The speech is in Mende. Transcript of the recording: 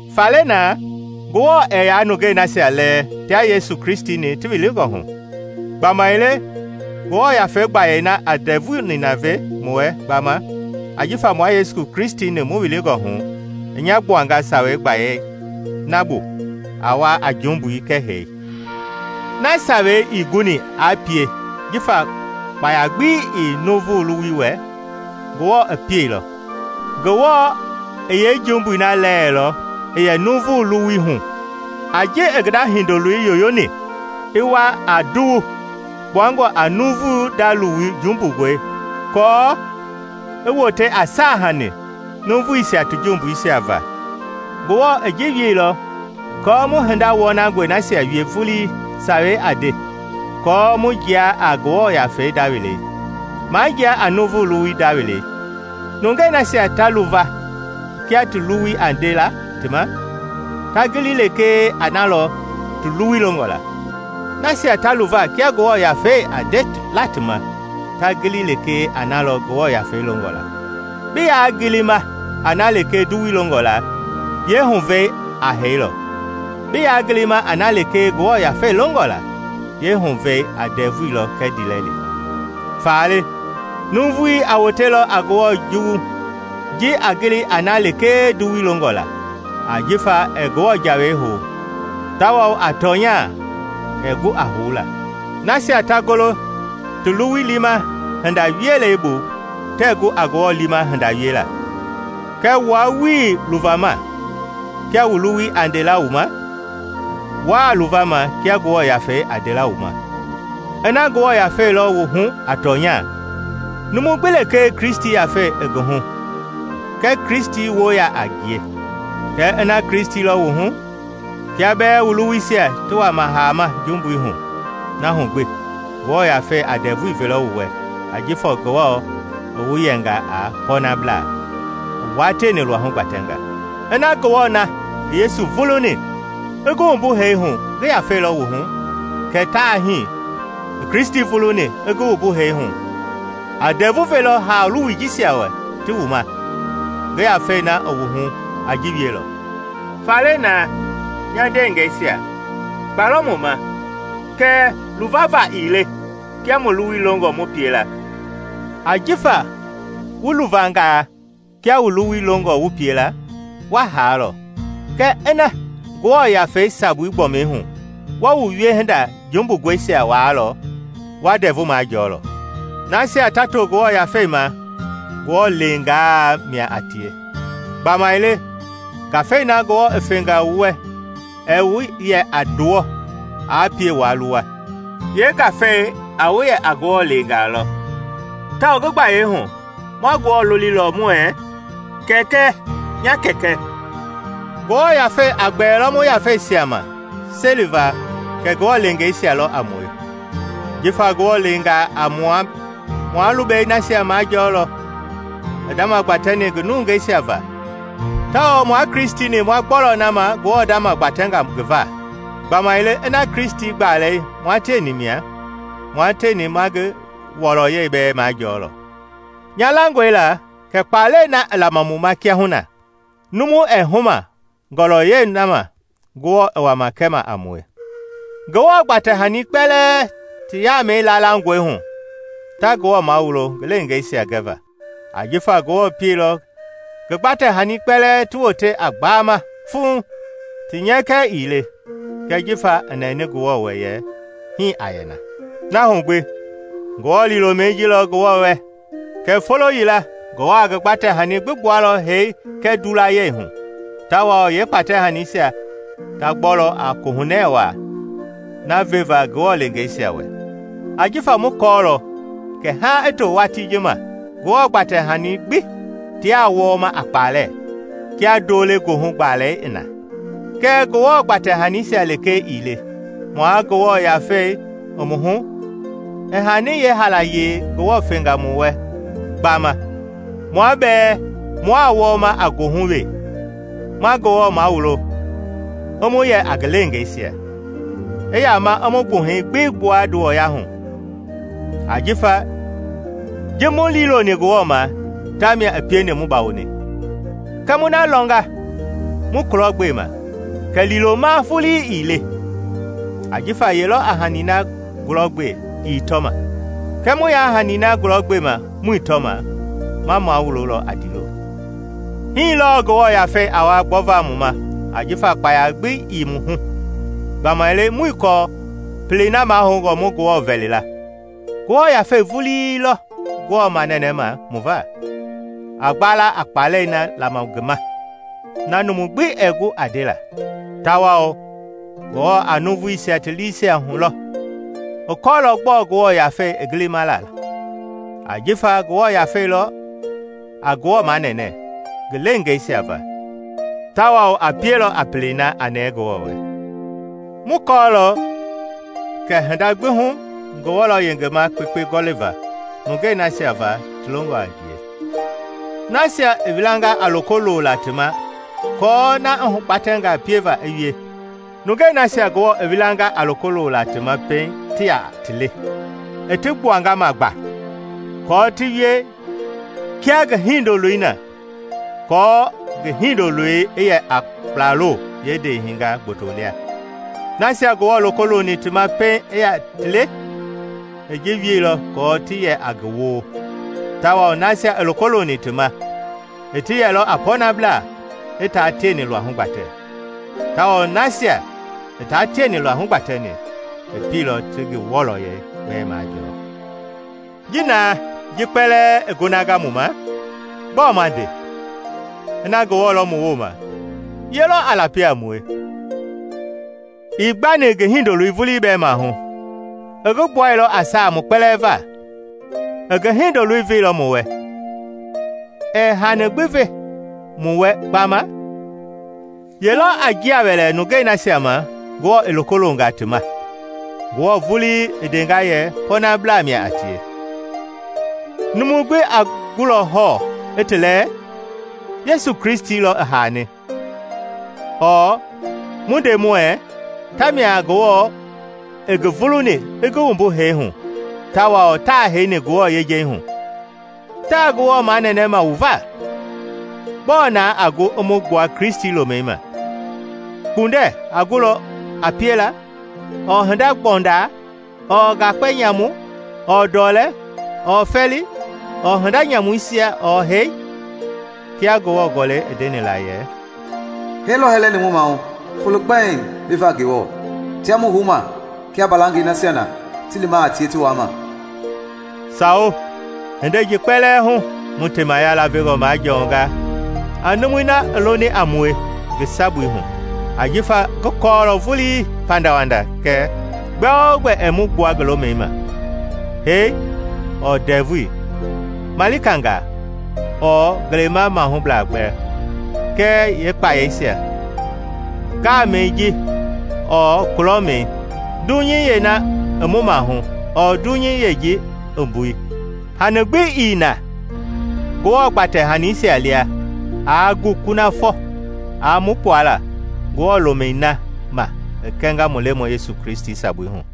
Faale naa, Ngewɔ ɛɛ yaa nungei nasia lɛɛ tia Yesu Kristi-ni ti wilingɔ hu. Gbamaile Ngewɔ Yafei gbayei na a ndɛvui nina ve mu wɛ gbama ajifa mua Yesu Kristi-ni mu wilingɔ hu, i nya gbuanga Sawei gbayei na bu a wa a jumbui kɛɛ hee. Na Sawei ii guni aa pie jifa kpaya gbi ii nuuvu luwui wɛ, Ngewɔ i pieilɔ. Ngewɔ i yeejumbui na lɛɛlɔ i yɛ nuuvu luwui hu a ji i ngi nda Hindoloi yoyoni i wa a nduwu kpuangɔ a nuuvu nda luwu jumbungɔi aako i wote a saahanii nuuvuisia ti jumbui va. Ngewɔ i ji wieilɔ aako mu hinda wɔnangɔi nasia wie vulii sawei a nde kɔɔ mu jia a Ngewɔ yafei nda welei, maa jia a nuuvu luwui nda welei. Nungei nasia ta luva kia ti luwui a nde la ti ma, ta gili lekee a na lɔ ti luwui longɔ la. Nasia ta luva kia Ngewɔ Yafei a nde la ti ma, ta gili lekee a na lɔ Ngewɔ Yafei longɔ la. Bi yaa gilima a na lekee nduwui longɔ la, yeehuvɛi a hee lɔ; bi yaa gilima a na lekee Ngewɔ Yafei longɔ la, yeehuvɛi a ndɛvui lɔ kɛɛ ndiilɛli. Faale, nuuvui a wotelɔ a Ngewɔ juwu ji a gili a na lekee nduwui longɔ la, ajifa ɛɛ Ngewɔ Jawei hou, tawao, a tɔnya, ɛɛ gu a houla. Nasia ta golo ti luwui liima hindei wielei bu tɛɛ gu a Ngewɔ liima hinda wiela. Kɛɛ wua wuii luvama kia wu luwui a nde la wu ma; wuaa luvama kia Ngewɔ Yafei a nde la wu ma -- ina Ngewɔ Yafei lɔ wu hu a tɔnya. Numu gbi lekee Kristi Yafei ii ngi hu kɛ Kristi woo yaa a ngie. Kɛɛ ina Kristi lɔ wu hu, kia bɛɛ wu luwuisia ti wama haama jumbui hu, na hu gbi Ngewɔ Yafei a ndɛvui velɔ wu wɛ ajifa Ngewɔ i wu yɛnga a pɔnablaa, i wua tieni luahu gbatɛnga. Ina Ngewɔ na i Yesu vuluni i ngi wumbu hee hu ngi Yafei lɔ wu hu, kɛ ta hii i Kristi vuluni i ngi wumbu hee hu a ndɛvu velɔ haa luwui jisia wɛ ti wu ma; ngi Yafei na i wu hu a ji wielɔ. Faale naa, nya ndeengɛisia, kpa lɔ mu ma, kɛɛ luvava ii le kia mu luwui longɔ mu pie la. Ajifa wu luvangaa kia wu luwui longɔ wu pie la, wa haalɔ; kɛɛ ina Ngewɔ Yafei sabui gbɔmi hu wa wu wiehinda jumbungɔisia waalɔ, wa ndɛvu majɔɔlɔ. Nasia ta to Ngewɔ Yafei ma, Ngewɔ leengaa mia a tie. Gbamaile Ngafei na Ngewɔ i fenga wu wɛ ɛɛ wu yɛ a nduwɔ aa pie waa luwa; yee-Ngafei a wu yɛ a Ngewɔ leengaa lɔ, tawao ngi gbayei hu ma Ngewɔ lolilɔ muɛɛ, “Kɛkɛ! Nya Kɛkɛ!” Ngewɔ Yafei a gbɛɛlɔ mu yafeisia ma seliva kɛ Ngewɔ leengeisia lɔ a mue. Jifa Ngewɔ leengaa a mua, ma lubɛi nasia majɔɔlɔ i ndama gbatɛni ngi nungɛisia va, tawao mua Kristi-ni ma gbɔlɔ na ma Ngewɔ ndama gbatɛnga ngi va, gbamaile ina Kristi gbalei mua tieni mia, mua tieni ma ngi wɔlɔyɛi bɛɛ majɔɔlɔ. Nya langɔe la kɛ kpalɛi na i lama mu ma kiahuna numu ɛɛ huma ngɔlɔyɛi na ma Ngewɔ i wama kɛma a mue. Ngewɔ gbatɛ-hani kpɛlɛɛ ti yaamɛi laalangɔe hu ta Ngewɔ mawulo ngi leengeisia gɛva. Ajifa Ngewɔ pieilɔ ngi gbatɛ-hani kpɛlɛɛ ti wote a gbaama fuŋ, ti nyɛkɛ ii le, kɛɛ jifa i nɛɛni Ngewɔ wɛ yɛ hii a yɛ na. Na hu gbi Ngewɔ liilomɛi ji lɔ Ngewɔ wɛ, kɛ folo yila Ngewɔ a ngi gbatɛ-hani gbi gbualɔ hee kɛɛ ndulayɛi hu, tawao yee kpatɛ-haniisia ta gbɔ lɔ a kohunɛ wai na veva Ngewɔ leengeisia wɛ. Ajifa mu kɔɔlɔ kɛ haaŋ i to watii ji ma Ngewɔ gbatɛ-hani gbi tiaa wɔɔma a kpalɛ kia ndo-le-goohugbalɛi i na. Kɛɛ Ngewɔ gbatɛ-hanisia lekee ii le; mua Ngewɔ Yafei i mu hu a hanii yeehaalayee Ngewɔ fenga mu wɛ gbama, mua bɛɛ mua wɔɔma a goohu wee, ma Ngewɔ mawulo i mu yɛ a ngi leengeisia, i yama i mu gbuhɛi gbi gbua nduwɔya hu. Ajifa ji mu liiloni Ngewɔ ma tamia i pieni mu bawoni; kɛɛ mu na lɔngaa mu kulɔgbema, kɛ liiloma vulii ii le. Ajifa ye lɔ a hani na gulɔgbe i tɔma? Kɛɛ mu yaa hani na gulɔgbema muii tɔma, ma mawulolɔ a ndiilo. Hii lɔɔ Ngewɔ Yafei a wa gbɔva mu ma ajifa kpaya gbi ii mu hu. Gbamaile muii kɔɔ pelei na mahoungɔ mu Ngewɔ vɛli la; Ngewɔ Yafei vulii lɔ Ngewɔ manɛnɛma mu va, a gbala a kpalɛi na lama ngi ma na numu gbi ɛɛ gu a ndela. Tawao Ngewɔ na a nuuvuisia ti liisia hulɔ, i kɔɔlɔ gbɔɔ Ngewɔ Yafei i gilima la; ajifa Ngewɔ Yafei lɔ a Ngewɔ manɛnɛ ngi leengeisia va tawao a pielɔ a pelei na a nɛɛ Ngewɔ wɛ. Mu kɔɔlɔ kɛ hinda gbi hu Ngewɔ lɔ yengema kpekpe gɔliva nungei nasia va ti longɔ a ngie, nasia i wilanga a loko lola ti ma aako na i hugbatɛnga pieva i wie. Nungei nasia Ngewɔ i wilanga a loko lola ti ma pɛiŋ, ti ya ti le, i ti gbuanga ma gba kɔɔ ti wie kia ngi Hindoloi na, aako ngi Hindoloi i yɛ a kplaloo ndewehingaa gboto lia. Nasia Ngewɔ loko looni ti ma pɛiŋ i ya ti le, i ji wielɔ kɔɔ ti yɛ a ngi woo; tawao nasia i loko looni ti ma i ti yɛlɔ a pɔɔnablaa i taa tieni luahu gbatɛ; tawao nasia i taa tieni luahu gbatɛni, i pieilɔ ti ngi wɔlɔyɛi bɛɛ majɔɔ. Ji na ji kpɛlɛɛ i gonanga mu ma, gbɔɔ ma nde? Ina Ngewɔ lɔ mu wooma, ye lɔ a lapi a mue? Ii gbani ngi Hindoloi vulii bɛɛ mahu, i ngi gbuailɔ a saa mu kpɛlɛɛ va! I ngi Hindoloi veilɔ mu wɛ -- ɛɛ hani gbi ve mu wɛ gbama? Ye lɔ a njia wɛlɛ nungei nasia ma Ngewɔ i loko longa ti ma? Ngewɔ vulii i ndenga yɛ pɔɔnablaa mia a tie. Numu gbi a gulɔ hɔɔ i ti lɛɛ? Yesu Kristi lɔ i haani, ɔɔ mu nde muɛɛ, tamia Ngewɔ i ngi vuluni i ngi wumbu hee hu tawao taa heini Ngewɔ yejei hu. Taa Ngewɔ manɛnɛma mu va. Gbɔɔ naa a gu i mu gbua Kristi lomɛi ma? Kpundɛ a gulɔ a piela ɔɔ hindagbɔundaa ɔɔ ngakpɛ nyamu ɔɔ ndɔlɛ ɔɔ fɛɛli ɔɔ hinda nyamuisia ɔɔ hee? Kia Ngewɔ Gɔlɛi i ndeni la yɛ, “Hee lɔ hɛlɛni mu mahu folo kpɛiŋ bi va Ngewɔ tiaa mu houma kia mbalangɛi nasia ti lima a tie ti waama.” Sawo, hindei ji kpɛlɛɛ hu mu temaya lavengɔ majɔɔnga a numu na i loni a mue ngi sabui hu! Ajifa ngi kɔɔlɔ vuli pandawanda kɛ gbɛogbɛ ɛɛ mu gbua ngi lomɛi ma: hee ɔɔ ndɛvui; malikangaa ɔɔ ngelema-mahugbeblaa kɛɛ yeekpayɛisia; ngaamɛi ji ɔɔ kulɔmɛi; dunyei yeena i mu maahu ɔɔ dunyei yeeji i mbui -- hani gbi ii na Ngewɔ gbatɛ-hanisia lia aa gu kunafɔ a mu gbuala Ngewɔ lomɛi na ma i kɛnga mu Lemɔi Yesu Kristi sabui hu.